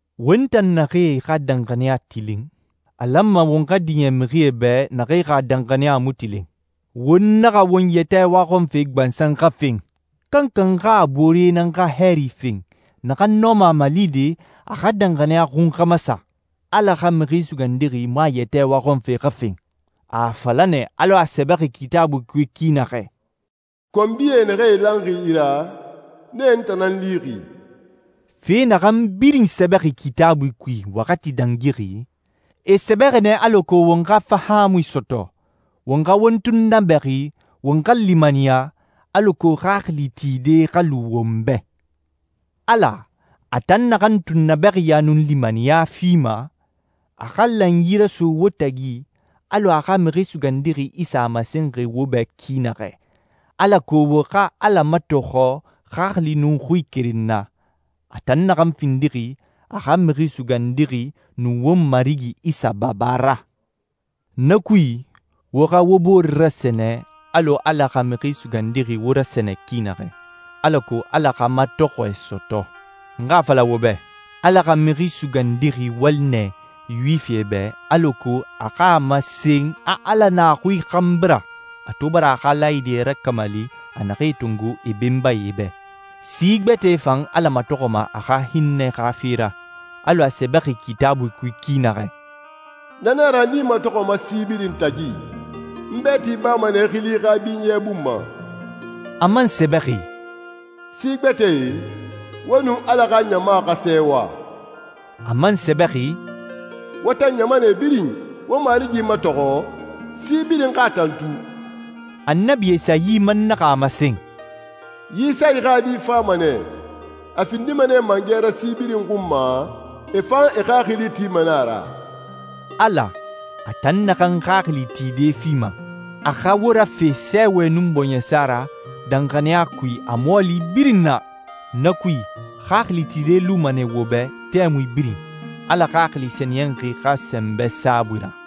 Won tan naxee xa danxaniya tilin, a lanma won xa diɲɛ mixie bɛ naxee xa danxaniya mu tilin. Won naxa won yɛtɛ waxɔnfe gbansan xa fen. Kankan xa a boore nan xa hɛɛri fen, naxan nɔma a malide a xa danxaniya xun xa masa. Ala xa Mixi Sugandixi mu a yɛtɛ waxɔnfe xa fen. A a fala nɛ alɔ a sɛbɛxi Kitaabui kui ki naxɛ, «Konbie naxee ilanxi i ra, nee n tan nan lixi.» Fe naxan birin sɛbɛxi Kitaabui kui waxati dangixi, e sɛbɛxi nɛ alako won xa fahaamui sɔtɔ, won xa won tunnabɛxi, won xa limaniya, alako xaxili tide xa lu won bɛ. Ala, a tan naxan tunnabɛxiya nun limaniya fima, a xa lanyi raso wo tagi alɔ a xa Mixi Sugandixi Isa a masenxi wo bɛ ki naxɛ, alako wo xa Ala matɔxɔ xaxili nun xui keren na, a tan naxan findixi a xa Mixi Sugandixi nun won Marigi Isa Baba ra. Na kui, wo xa wo bore rasɛnɛ alɔ Ala xa Mixi Sugandixi wo rasɛnɛ ki naxɛ, alako Ala xa matɔxɔɛ sɔtɔ. N xa a fala wo bɛ, Ala xa Mixi Sugandixi wali nɛ Yuwifie bɛ alako a xa a masen a Ala na a xui xanbi ra a to bara a xa laayidie rakamali a naxee tongo e benbae bɛ. Si gbɛtɛe fan Ala matɔxɔma a xa hinnɛ xa fe ra, alɔ a sɛbɛxi Kitaabui kui ki naxɛ, «Na nan a ra n i matɔxɔma si birin tagi, n bɛɛti bama nɛ i xili xa binyɛ bun ma.» A man sɛbɛxi, «Si gbɛtɛe, wo nun Ala xa ɲama xa sɛɛwa.» A man sɛbɛxi, «Wo tan ɲamanɛe birin, wo Marigi matɔxɔ, si birin xa a tantu.» Annabi Esayi man naxa a masen, «Yisayi xa di fama nɛ. A findima nɛ mangɛ ra si birin xun ma, e fan e xaxili tima nɛ a ra.» Ala, a tan naxan xaxili tide fima, a xa wo rafe sɛɛwɛ nun bɔɲɛsa ra danxaniya kui a mɔɔli birin na. Na kui, xaxili tide luma nɛ wo bɛ tɛmui birin, Ala Xaxili Sɛniyɛnxi xa sɛnbɛ saabui ra.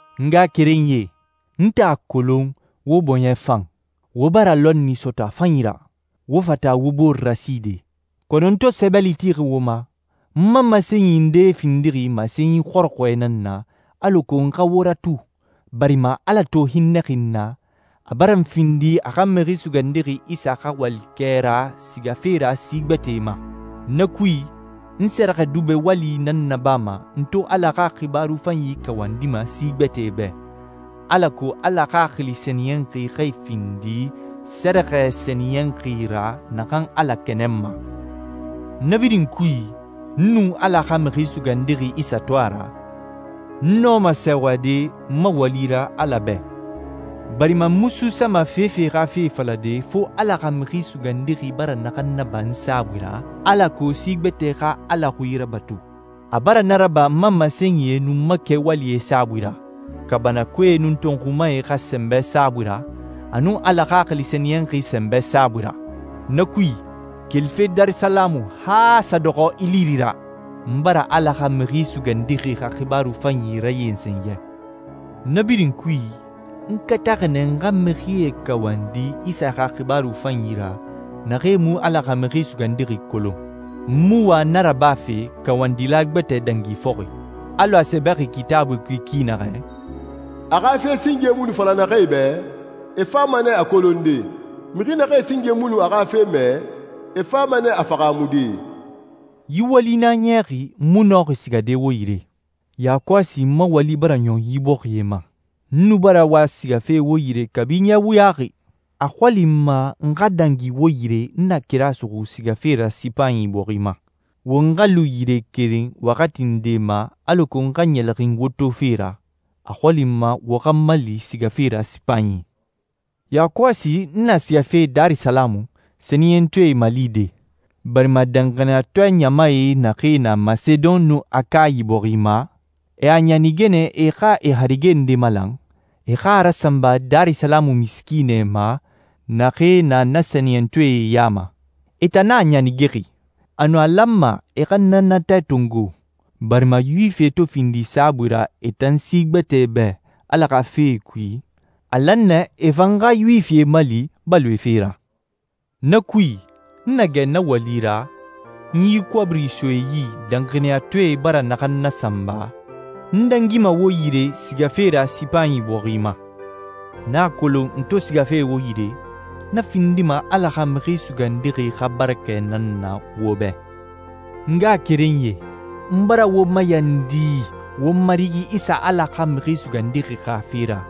N ngaxakerenyie, n tan a kolon wo bɔɲɛ fan, wo bara lɔnni sɔtɔ a fanyi ra, wo fata wo bore raside. Kɔnɔ n to sɛbɛli tixi wo ma, n ma masenyi ndee findixi masenyi xɔrɔxɔɛe nan na alako n xa wo ratu, barima Ala to hinnɛxi n na, a bara n findi a xa Mixi Sugandixi Isa xa walikɛ ra sigafe ra si gbɛtɛe ma. Na kui, n sɛrɛxɛdubɛ wali nan nabama n to Ala xa xibaaru fanyi kawandima si gbɛtɛe bɛ, alako Ala Xaxili Sɛniyɛnxi xa e findi sɛrɛxɛ sɛniyɛnxi ra naxan Ala kɛnɛnma. Na birin kui, n nun Ala xa Mixi Sugandixi Isa to a ra, n nɔma sɛɛwade n ma wali ra Ala bɛ, barima n mu suusama fefe xa fe falade fo Ala xa Mixi Sugandixi bara naxan naba n saabui ra, alako si gbɛtɛe xa Ala xui rabatu. A bara na raba n ma masenyie nun n ma kɛwalie saabui ra, kaabanakoe nun tɔnxumae xa sɛnbɛ saabui ra, a nun Ala Xaxili Sɛniyɛnxi sɛnbɛ saabui ra. Na kui, kelife Darisalamu han a sa dɔxɔ Iliri ra, n bara Ala xa Mixi Sugandixi xa xibaaru fanyi rayensen yɛ. Na birin kui, n kataxi nɛ n xa mixie kawandi Isa xa xibaaru fanyi ra naxee mu Ala xa Mixi Sugandixi kolon. N mu wa na rabafe kawandila gbɛtɛ dangi fɔxi. Alɔ a sɛbɛxi Kitaabui kui ki naxɛ, «A xa fe singe mu nu fala naxee bɛ, e fama nɛ a kolonde. Mixi naxee singe mu nu a xa fe mɛ, e fama nɛ a fahaamude.» Yi wali nan a niyaxi n mu nɔxi sigade wo yire. Yakɔsi n ma wali bara ɲɔn yi bɔxie ma. N nu bara wa sigafe wo yire kabi ɲɛ wuyaxi. A xɔli n ma n xa dangi wo yire n na kira suxu sigafe ra Sipanyi bɔxi ma. Won xa lu yire keren waxati nde ma alako n xa ɲɛlɛxin wo tofe ra, a xɔli n ma wo xa n mali sigafe ra Sipanyi. Yakɔsi n na sigafe Darisalamu sɛniyɛntɔɛe malide, barima danxaniyatɔɛ ɲamae naxee na Masedon nun Akayi bɔxi ma, e a ɲanige nɛ e xa e harige nde malan, e xa a rasanba Darisalamu misikiinɛe ma naxee na na sɛniyɛntɔɛe ya ma. E tan nan a ɲanigexi. Anun, a lanma e xa na natɛ tongo barima Yuwifie to findi saabui ra e tan si gbɛtɛe bɛ Ala xa fee kui, a lan nɛ e fan xa Yuwifie mali baloe fe ra. Na kui, n na gɛ na wali ra, n yi kɔbiri so e yi danxaniyatɔɛe bara naxan nasanba, n dangima wo yire sigafe ra Sipanyi bɔxi ma. N a kolon n to sigafe wo yire, na findima Ala xa Mixi Sugandixi xa barakɛ nan na wo bɛ. N ngaxakerenyie, n bara wo mayandi won Marigi Isa Ala xa Mixi Sugandixi xa fe ra,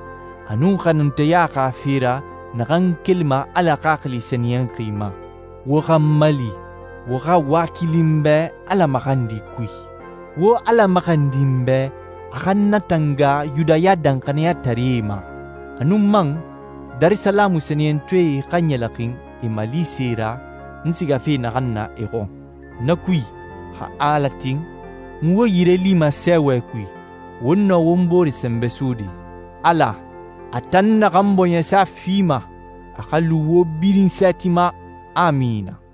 a nun xanunteya xa fe ra naxan kelima Ala Xaxili Sɛniyɛnxi ma, wo xa n mali, wo xa wakili n bɛ Ala maxandi kui. Wo Ala maxandi n bɛ a xa n natanga Yudaya danxaniyataree ma, a nun man, Darisalamu sɛniyɛntɔɛe xa ɲɛlɛxin e malise ra n sigafe naxan na e xɔn. Na kui, xa Ala tin, n wo yire lima sɛɛwɛ kui, won nɔ won bore sɛnbɛ sode. Ala, a tan naxan bɔɲɛsa fima, a xa lu wo birin sɛɛti ma. Amina.